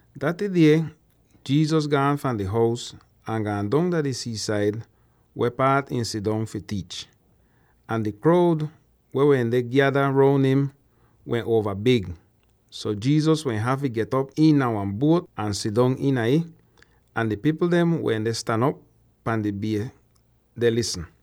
Daty die Jesus gaan fahn di hous ahn gaan dong dah di sii-said weh paat ihn sidong fi tiich. Ahn di kroud weh wende gyada roun im wehn uova big, so Jesus wehn hafy get'op iina wan buot ahn sidong iina ih, ahn di pipl dem wende stan op pan di bie deh lisn.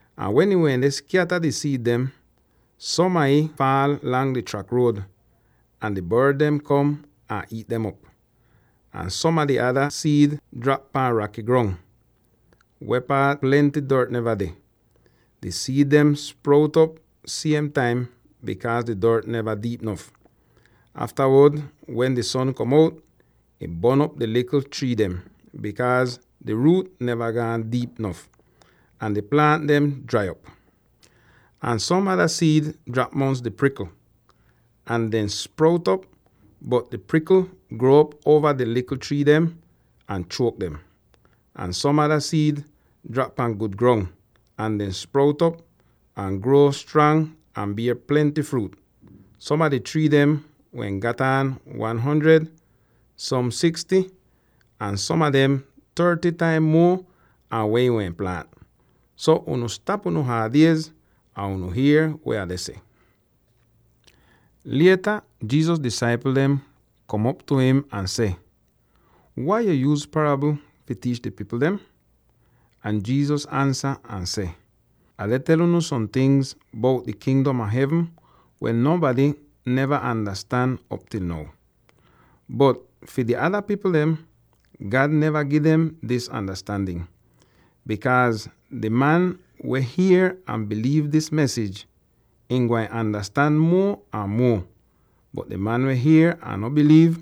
Ahn wen ihn wende skyata di siid dem, som a ih faal lang di trak ruod, ahn di bord dem kom ahn iit dem op. Ahn som a di ada siid drap pan raky grong, weh paat plenty dort neva deh. Di siid dem sprout op siem taim bikaaz di dort neva diip nof. Aftawod wen di son kom out, ih bon'op di likl trii dem, bikaaz di ruut neva gaan diip nof, ahn di plaant dem drai op. Ahn som ada siid drap mongs di prikl, ahn dehn sprout op, bot di prikl gruo'op uova di likl trii dem, ahn chuok dem. Ahn som ada siid drap pan gud grong; ahn dem sprout op, ahn gruo strang ahn bier plenty fruut. Som a di trii dem wehn gat aan one hundred, som sixty, ahn som a dem thirty taim muo an weh ihn wehn plaant! “So, unu stap unu haad iez, ahn unu hier weh Ah deh seh!” Lieta Jesus disaipl dem kom op tu im ahn seh, “Wai yu yuuz parabl fi tiich di pipl dem?” Ahn Jesus ansa ahn seh, “Ah deh tel unu som tingz bout di Kingdom a Hevn weh nonbady neva andastan op til now. Bot fi di ada pipl dem, God neva gi dem dis andastandin. Bikaaz di man weh hier ahn biliiv dis mesij, ihn gwain andastan muo ahn muo; bot di man weh hier ahn no biliiv,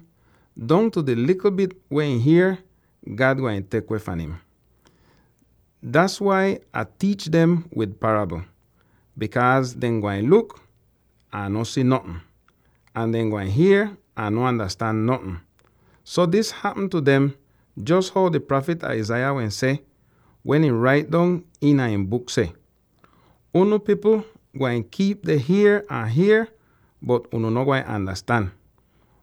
dongtu di likl bit weh ihn hier, God gwain tek weh fahn im. Das wai Ah tiich dem wid parabl, bikaaz dehn gwain luk, ahn no si notn; ahn dehn gwain hier, ahn no andastan notn. So dis hapm tu dem jos how di prafit Isaiah wehn seh, wen ihn rait dong iina ihn buk seh: ‘Unu pipl gwain kiip deh hier ahn hier, bot unu no gwain andastan.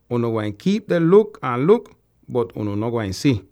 Unu gwain kiip deh luk ahn luk, bot unu no gwain si.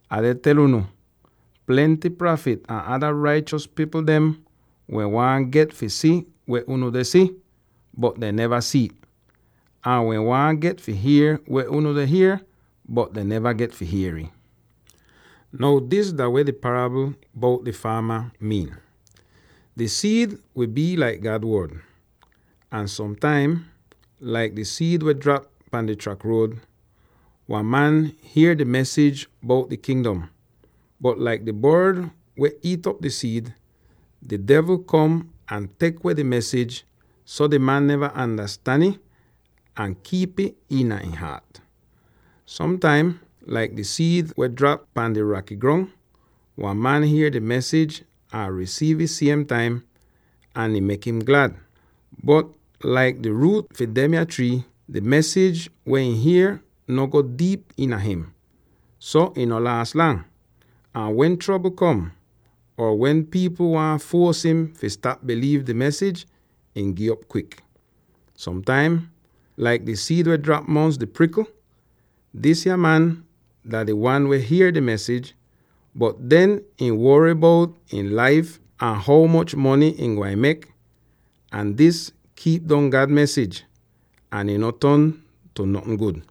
Ah deh tel unu: plenty prafit ahn ada raichos pipl dem wehn waahn get fi si weh unu deh si, bot dehn neva si'it; ahn wehn waahn get fi hier weh unu deh hier, bot dehn neva get fi hier'ih.” “Now dis dah weh di parabl bout di faama miin: Di siid wi bii laik God Wod, ahn som taim, laik di siid weh drap pan di trak ruod, wan man hier di mesij bout di Kingdom, bot laik di bord weh iit'op di siid, di devl kom ahn tek weh di mesij, so di man neva andastan ih ahn kiip'ih iina ihn haat. Som taim, laik di siid weh drap pan di raky grong, wan man hier di mesij ahn risiiv ih siem taim, ahn ih mek im glad. Bot laik di ruut fi demya trii, di mesij weh ihn hier no go diip iina him. So ihn no laas lang, ahn wen trobl kom, or wen pipl waahn fuos im fi stap biliiv di mesij, ihn gi'op kwik. Som taim, laik di siid weh drap mongs di prikl, disya man dah di wan weh hier di mesij, bot aftawod ihn wory bout ihn laif ahn ho moch mony ihn gwain mek, ahn dis kiip dong God mesij, ahn ihn no ton tu notn gud.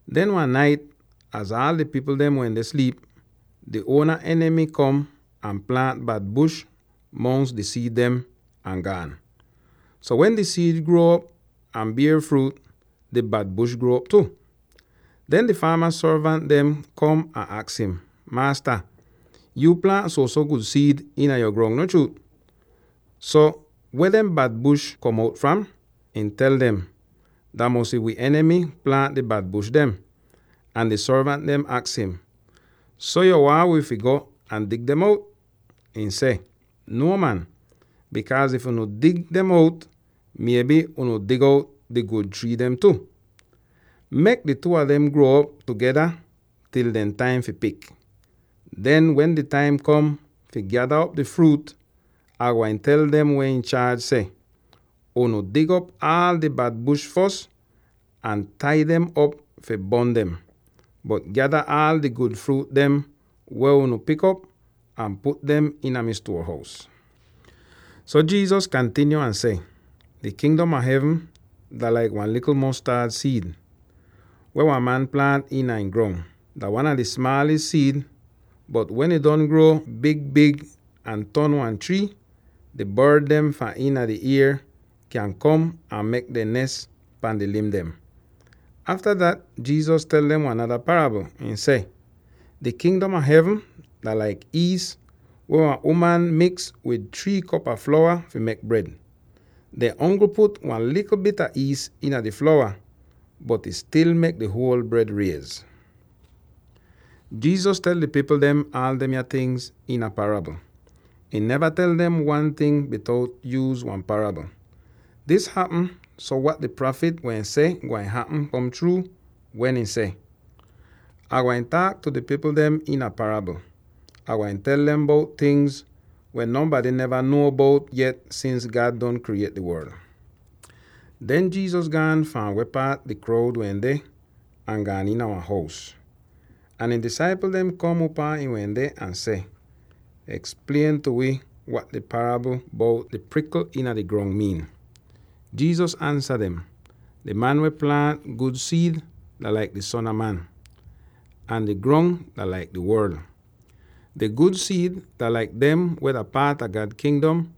Den wan nait, az aal di pipl dem wende sliip, di uona enimy kom ahn plaant bad bush mongs di siid dem, ahn gaan. So wen di siid gruo'op ahn bier fruut, di bad bush gruo'op tu. Den di faama sorvant dem kom ahn aks im, ‘Maasta, yuu plaant suoso gud siid iina yo grong, no chruut? So weh dem bad bush kom out fram?’ Ihn tel dem, ‘Dah mosy wi enimy plaant di bad bush dem!’ Ahn di sorvant dehn aks im, ‘So yo waahn wi fi go ahn dig dem out?’ Ihn seh, ‘Nuo man, bikaaz if unu dig dem out, mieby unu dig out di gud trii dem tu. Mek di two a dem gruo'op tugeda til dehn taim fi pik. Den, wen di taim kom fi gyada op di fruut, Ah gwain tel dem weh inchaaj seh, “Unu dig op aal di bad bush fos ahn tai dem op fi bon dem, bot gyada aal di gud fruut dem weh unu pik op ahn put dem iina mi stuor-hous.”’” So Jesus kantinyo ahn seh, “Di Kingdom a Hevn dah laik wan likl mostad siid, weh wan man plaant iina ihn grong. Dah wan a di smaalis siid, bot wen ih don gruo big-big ahn ton wan trii, di bord dem fahn iina di ier kyan kom ahn mek dehn nes pan di lim dem.” Afta dat Jesus tel dem wan nada parabl, ihn seh: “Di Kingdom a Hevn dah laik iis weh wan uman miks wid three kop a flowa fi mek bred. Dehn ongl put wan likl bit a iis iina di flowa, bot ih stil mek di huol bred riez.” Jesus tel di pipl dem aal demya tingz iina parabl. Ihn neva tel dem wan ting bitout yuuz wan parabl. Dis hapm so wat di prafit wehn seh gwain hapm kom chruu, weh ih seh: “Ah gwain taak tu di pipl dem iina parabl. Ah gwain tel dem bout tingz weh nonbady neva nuo bout yet sins God don kriyiet di worl.” Den Jesus gaan fahn weh paat di kroud wende ahn gaan iina wan hous. Ahn ihn disaipl dem kom upaa ihn wende ahn seh, “Eksplien tu wi wat di parabl bout di prikl iina di grong miin.” Jesus ansa dem, “Di man weh plaant gud siid dah laik di Son a Man, ahn di grong dah laik di worl. Di gud siid dah laik dem weh dah paat a God Kingdom,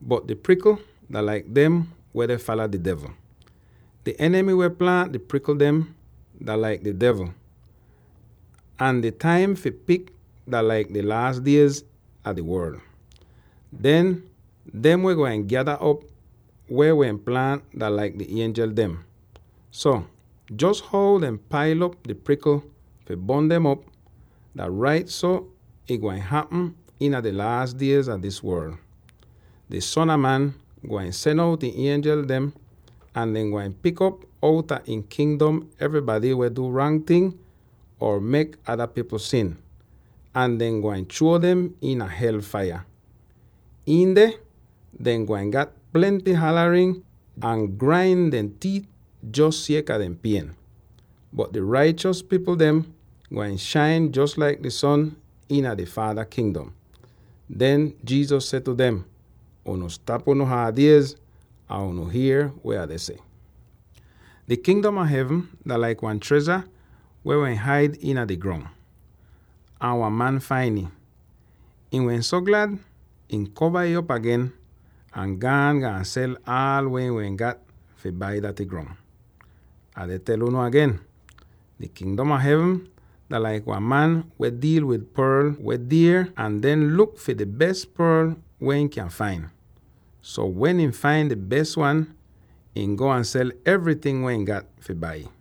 bot di prikl dah laik dem weh deh fala di devl. Di enimy weh plaant di prikl dem dah laik di devl, ahn di taim fi pik dah laik di laas diez a di worl. Den, dem weh gwain gyada op weh wehn plaant dah laik di ienjel dem. So, jos how dehn pail op di prikl fi bon dem op, dah rait so ih gwain hapm iina di laas diez a dis worl. Di Son a Man gwain sen out ihn ienjel dem, ahn dehn gwain pik op outa ihn Kingdom evrybady weh du rang ting or mek ada pipl sin, ahn dehn gwain chruo dem iina hel faiya. Iin deh, dehn gwain gat plenty halarin ahn grain dehn tiit jos sieka di pien. Bot di raichos pipl dem gwain shain jos laik di son iina dehn Faada Kingdom.” Den Jesus seh tu dem, “Unu stap unu haad iez, ahn unu hier weh Ah deh seh! “Di Kingdom a Hevn dah laik wan trezha weh wehn haid iina di grong, ahn wan man fain ih. Ihn wehn so glad, ihn kova ih op agen, ahn gaan, gaan sel aala weh ihn wehn gat fi bai daty grong. “Ah deh tel unu agen: di Kingdom a Hevn dah laik wan man weh diil wid porl biidz weh dier ahn deh luk fi di bes porl weh ihn kyan fain. So, wen ihn fain di bes wan, ihn go ahn sel evryting weh ihn gat fi bai'ih.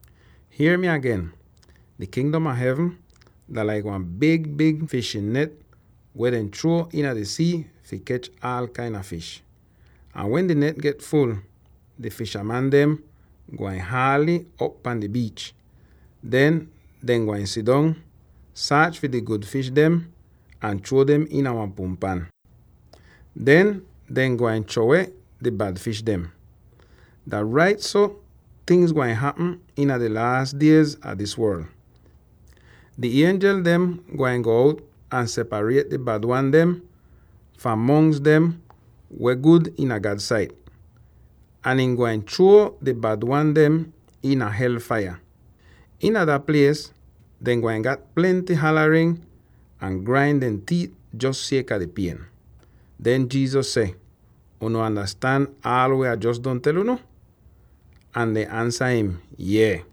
“Hier mi agen, di Kingdom a Hevn dah laik wan big-big fishin net weh dehn chruo iina di sii fi kech aal kain a fish. Ahn wen di net get ful, di fishaman dem gwain haal'ih op pahn di biich. Den dehn gwain sidong, saach fi di gud fish dem ahn chruo dem iina wan punpan, den dehn gwain chruo weh di bad fish dem. Dah rait so tingz gwain hapm iina di laas diez a dis worl. Di ienjel dem gwain go out ahn separiet di bad wan dem fahn mongs dem weh gud iina God sait, ahn ihn gwain chruo di bad wan dem iina hel faiya. Iina dah plies dehn gwain gat plenty halarin ahn grain dehn tiit jos sieka di pien.” Den Jesus seh, “Unu andastan aal weh Ah jos don tel unu?” Ahn dehn ansa im, “Yees.”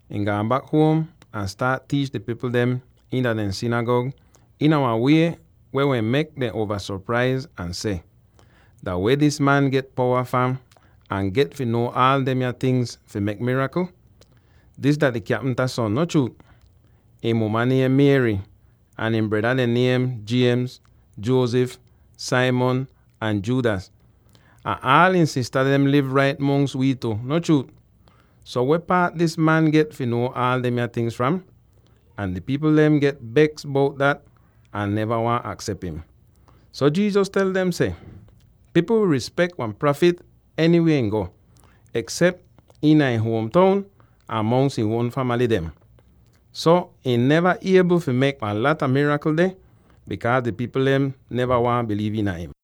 Ihn gaan bak huom ahn staat tiich di pipl dem iina dehn sinigag iina wan wie weh mek dem uova sopraiz ahn seh, “Dah weh dis man get powa fram ahn get fi nuo aal demya tingz fi mek mirakl? Dis dah di kyapimta son, no chruut? Ihn muma niem Mary, ahn ihn breda dehn niem James, Joseph, Simon, ahn Judas, ahn aal ihn sista dem liv rait mongs wi tu, no chruut? So, weh paat dis man get fi nuo aal demya tingz fram?” Ahn di pipl dem get beks bout dat ahn neva waahn aksep im. So Jesus tel dem seh, “Pipl wi rispek wan prafit enywie ihn go, eksep iina ihn huom toun ahn mongs ihn uon famaly dem.” So ihn neva iebl fi mek wan lata mirakl deh, bikaaz di pipl dehn neva waahn biliiv iina im.